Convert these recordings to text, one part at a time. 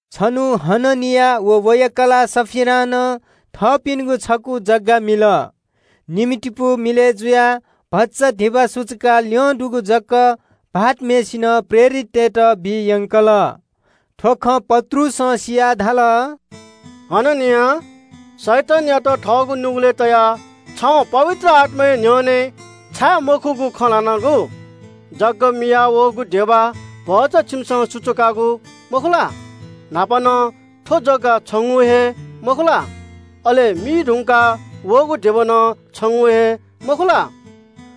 छन्‍हु हननिया व वया कलाः सफीरां नं थःपिनिगु छकू जग्‍गा मिल। निम्‍हतिपू मिलय् जुयाः भचा धिबा सुचुकाः ल्‍यं दुगु जक भाःतम्‍हय्‌सिनं प्रेरिततय्‌त बी यंकल। थ्‍व खँ पत्रुसं सियाः धाल – “हननिया, शैतानयात थःगु नुगलय् तयाः छिं पवित्र आत्‍माया न्‍ह्यःने छाय् मखुगु खँ ल्‍हानादियागु? जग्‍गा मियाः वःगु धिबा भचा छिकपिन्‍सं सुचुकादियागु मखु ला? न्‍हापा नं थ्‍व जग्‍गा छिगु हे मखु ला? अले मी धुंकाः वःगु धिबा नं छिगु हे मखु ला?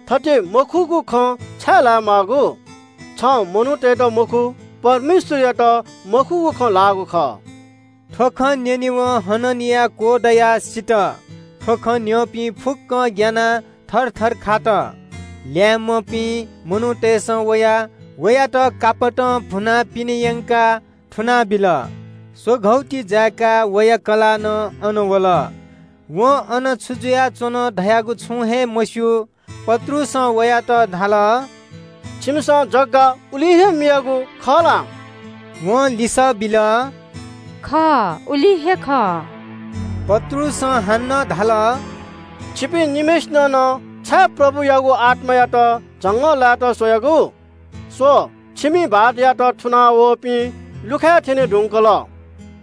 थथे मखुगु खँ छाय् ल्‍हानादी माःगु? छिं मनूतय्‌त मखु, परमेश्‍वरयात मखुगु खँ ल्‍हानादीगु खः।” थ्‍व खँ न्‍यनेवं हननिया क्‍वदयाः सित। थ्‍व खँ न्‍यंपिं फुक्‍कं ग्‍यानाः थरथर खात। ल्‍याय्‌म्‍हपिं मनूतय्‌सं वयाः वयात कापतं भुनाः पिने यंकाः थुनाबिल। स्‍वघौ ति जाय्‌काः वया कलाः नं अन वल। वं अन छु जुयाच्‍वन धयागु छुं हे मस्‍यू। पत्रुसं वयात धाल – “छिकपिन्‍सं जग्‍गा उलिं हे मियादीयागु खः ला?” वं लिसः बिल – “खः, उलिं हे खः।” पत्रुसं हानं धाल – “छिकपिं निम्‍हय्‌सिनं नं छाय् प्रभुयागु आत्‍मायात झंगःलाय्‌त स्‍वयादियागु? स्‍व, छिकपिनि भाःतयात थुना वःपिं लुखाय् थ्‍यने धुंकल।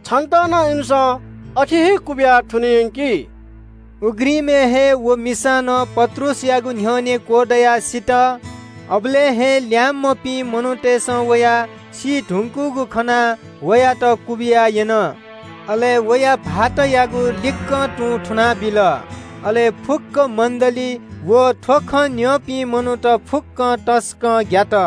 छितः नं इमिसं अथे हे क्‍वबिया थुने यंकी।” उघ्रिमय् हे व मिसा नं पत्रुसयागु न्‍ह्यःने क्‍वदयाः सित। अबलय् हे ल्‍याय्‌म्‍हपिं मनूतय्‌सं वयाः सी धुंकूगु खनाः वयात नं क्‍वबिया यन। अले वया भाःतयागु लिक्‍क तुं थुनाबिल। फुक्‍क मण्‍डली व थ्‍व खँ न्‍यंपिं मनूत सकलें तसकं ग्‍यात।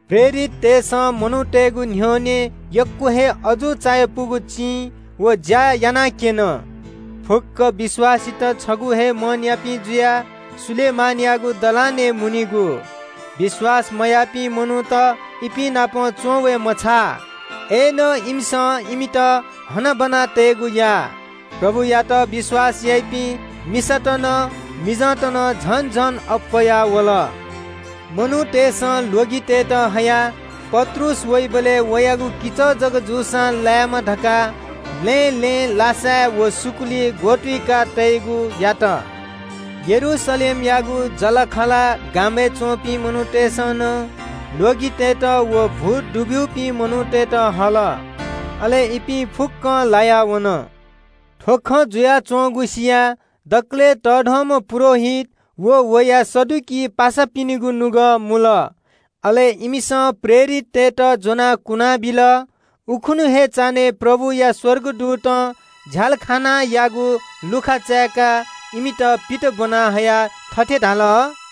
प्रेरिततय्‌सं मनूतय्‌गु न्‍ह्यःने यक्‍व हे अजू चायापुगु चिं व ज्‍या यानाक्‍यन। फुक्‍क विश्‍वासीत छगू हे मनयापिं जुयाः सोलोमनयागु दलानय् मुनीगु। विश्‍वास मयाःपिं मनूत इपिं नाप च्‍वंवये मछाः, अय्‌नं इमिसं इमित हनाबना तयेगु याः। प्रभुयात विश्‍वास याइपिं, मिसात नं मिजंत नं झन झन अप्‍वयावल। मनूतय्‌सं ल्‍वगितय्‌त हयाः पत्रुस वइबलय् वयागु किचः जक जूसां लाय्‌मा धकाः लँय् लँय् लासाय् व सुकुली ग्‍वतुइका तयेगु यात। यरूशलेमयागु जःलाखःला गामय् च्‍वंपिं मनूतय्‌सं नं ल्‍वगितय्‌त व भूत दुब्‍यूपिं मनूतय्‌त हल। अले इपिं फुक्‍कं लाया वन। थ्‍व खँ जुयाच्‍वंगु सियाः दकलय् तःधंम्‍ह पुजाहारी व वया सदुकी पासापिनिगु नुगः मुल। अले इमिसं प्रेरिततय्‌त ज्‍वनाः कुनाबिल। उखुन्‍हु हे चान्‍हय् प्रभुया स्‍वर्गदूतं झ्‍यालखानायागु लुखा चाय्‌काः इमित पित ब्‍वना हयाः थथे धाल –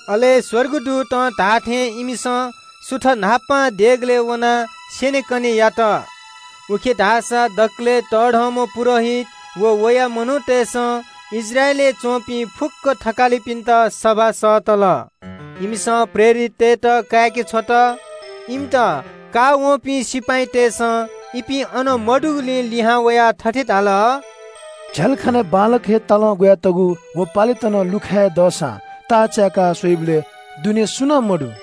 अले स्‍वर्गदूतं धाःथें इमिसं सुथ न्‍हापां देगलय् वनाः स्‍यनेकने यात। उखे धाःसा दकलय् तःधंम्‍ह पुजाहारी व वया मनूतय्‌सं इस्राएलय् च्‍वंपिं फुक्‍क थकालिपिन्‍त सभा सःतल। इमिसं प्रेरिततय्‌त काय्‌के छ्वल। इमित काःवंपिं सिपाइँतय्‌सं इपिं अन मदुगुलिं लिहां वयाः थथे धाल – “झ्‍यालखानाय् बांलाक हे तालं ग्‍वयातःगु व पालेत नं लुखाय् हे दःसां ताः चाय्‌का स्‍वयाबलय् दुने सुं नं मदु।”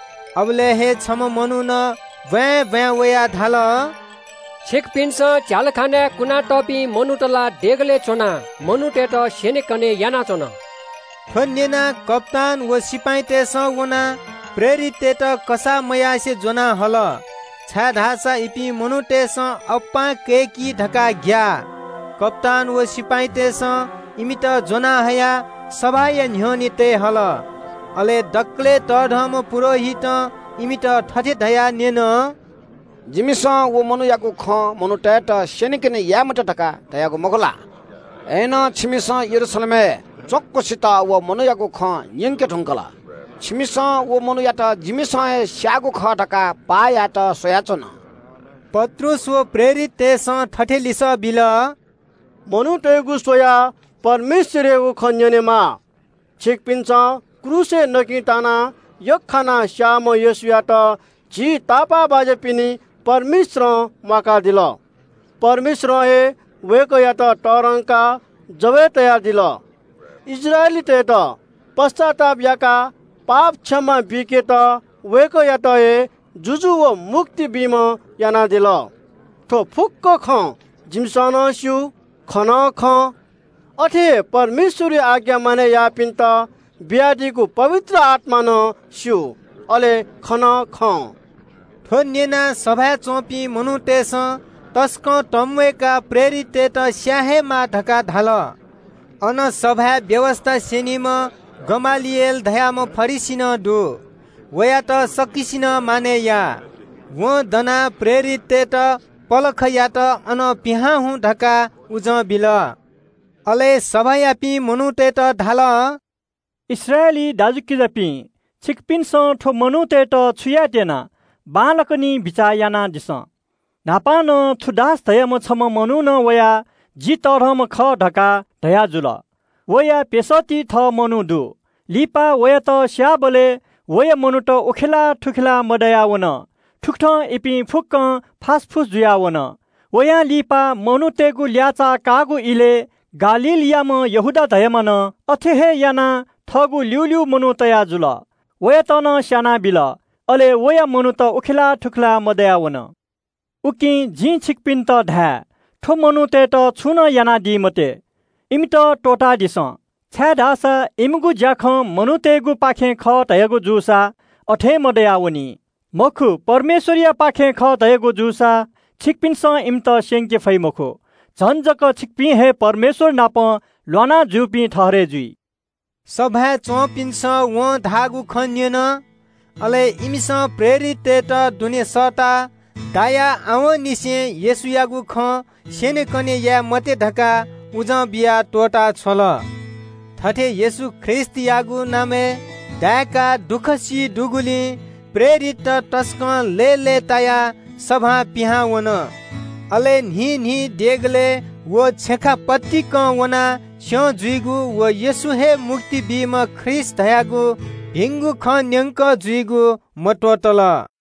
अबलय् हे छम्‍ह मनुखं ब्‍वाँय् ब्‍वाँय् वयाः धाल – “छिकपिन्‍सं झ्‍यालखानाय् कुना तःपिं मनूत ला देगलय् च्‍वनाः मनूतय्‌त स्‍यनेकने यानाच्‍वन।” थ्‍व न्‍यनाः कप्‍तान व सिपाइँतय्‌सं वनाः प्रेरिततय्‌त कसाः मयासें ज्‍वना हल, छाय्‌धाःसा इपिं मनूतय्‌सं अप्‍पां कय्‌की धकाः ग्‍याः। कप्‍तान व सिपाइँतय्‌सं इमित ज्‍वनाहयाः सभाया न्‍ह्यःने तये हल। अले दकलय् तःधंम्‍ह पुजाहारीं इमित थथे धयाः न्‍यन – “जिमिसं व मनूयागु खँ मनूतय्‌त स्‍यनेकने याये मते धकाः धयागु मखु ला? अय्‌नं छिमिसं यरूशलेमय् च्‍वँक्‍वसित व मनूयागु खँ न्‍यंके धुंकल। छिमिसं व मनू सीगुया द्वपं जिमित बीत स्‍वयाच्‍वन।” पत्रुस व मेपिं प्रेरिततय्‌सं थथे लिसः बिल – “जिमिसं मनूतय्‌गु स्‍वयाः परमेश्‍वरयागु खँ न्‍यनेमाः। छिकपिन्‍सं क्रूसय् यख्‍खानाः स्‍याःम्‍ह येशूयात झी तापाःबाज्‍यापिनि परमेश्‍वरं म्‍वाकादिल। परमेश्‍वरं हे वय्‌कःयात तःधंकाः जव ल्‍हातय् तयादिल। इस्राएलीतय्‌त पश्‍चाताप याकाः पाप क्षमा बीकेत वय्‌कःयात हे जुजु व मुक्ति बीम्‍ह यानादिल। थ्‍व फुक्‍क खँ जिमिसं सि नं स्‍यू, खँ नं खं। अथे हे परमेश्‍वरया आज्ञा मानय् याःपिन्‍त बियादीगु पवित्र आत्‍मां नं स्‍यू, अले खँ नं खं।” थ्‍व न्‍यनाः सभाय् च्‍वंपिं मनूतय्‌सं तसकं तंम्‍वय्‌काः प्रेरिततय्‌त स्‍याये हे माः धकाः धाल। अन सभाय् व्‍यवस्‍था स्‍यनीम्‍ह गमलिएल धाःम्‍ह फरिसी नं दु। वयात सकसिनं मानय् याः। वं दनाः प्रेरिततय्‌त पलखयात अनं पिहां हुँ धकाः उजं बिल। अले सभायापिं मनूतय्‌त धाल – “इस्राएली दाजुकिजापिं, छिकपिन्‍सं थ्‍व मनूतय्‌त छु यायेत्‍यना बांलाक निं बिचाः यानादिसँ। न्‍हापा नं थूदास धाःम्‍ह छम्‍ह मनुखं वयाः ‘जि तःधंम्‍ह खः’ धकाः धयाजुल। वया प्‍यसःति थः मनू दु। लिपा वयात स्‍यायेधुंकाः वया मनूत उखेलाः थुखेलाः मदयावन। थुकथं इपिं फुक्‍कं फासफुस जुयाः वन। वयां लिपा मनूतय्‌गु ल्‍याःचाः काःगु इलय् गालीलयाम्‍ह यहूदा धाःम्‍हं नं अथे हे यानाः थःगु ल्‍यूल्‍यू मनू तया जुल। वयात नं स्‍यानाबिल। अले वया मनूत उखेलाः थुखेलाः मदयावन। “उकिं जिं छिकपिन्‍त धाये – थ्‍व मनूतय्‌त छुं नं यानादी मते। इमित त्‍वःतादिसँ, छाय्‌धाःसा इमिगु ज्‍याखँ मनूतय्‌गुपाखें खः धयागु जूसा अथें मदयावनी। मखु, परमेश्‍वरयापाखें खः धयागु जूसा छिकपिन्‍सं इमित स्‍यंके फइ मखु। झन जक छिकपिं हे परमेश्‍वर नाप ल्‍वाना जूपिं ठहरय् जुइ।” सभाय् च्‍वंपिन्‍सं वं धाःगु खँ न्‍यन। अले इमिसं प्रेरिततय्‌त दुने सःताः कोर्रां दाय्‌काः आवंनिसें येशूयागु खँ स्‍यनेकने याये मते धकाः उजं बियाः त्‍वःता छ्वल। थथे येशू ख्रीष्‍टयागु नामय् दाय्‌काः दुःख सी बहःपिं जूगुलिं प्रेरितत तसकं लय्‌लय्‌तायाः सभां पिहां वन। अले न्‍हिं न्‍हिं देगलय् व छेँखा पतिकं वनाः स्‍यं जुइगु व येशू हे मुक्ति बीम्‍ह ख्रीष्‍ट खः धयागु भिंगु खँ न्‍यंकः जुइगु मत्‍वःतल।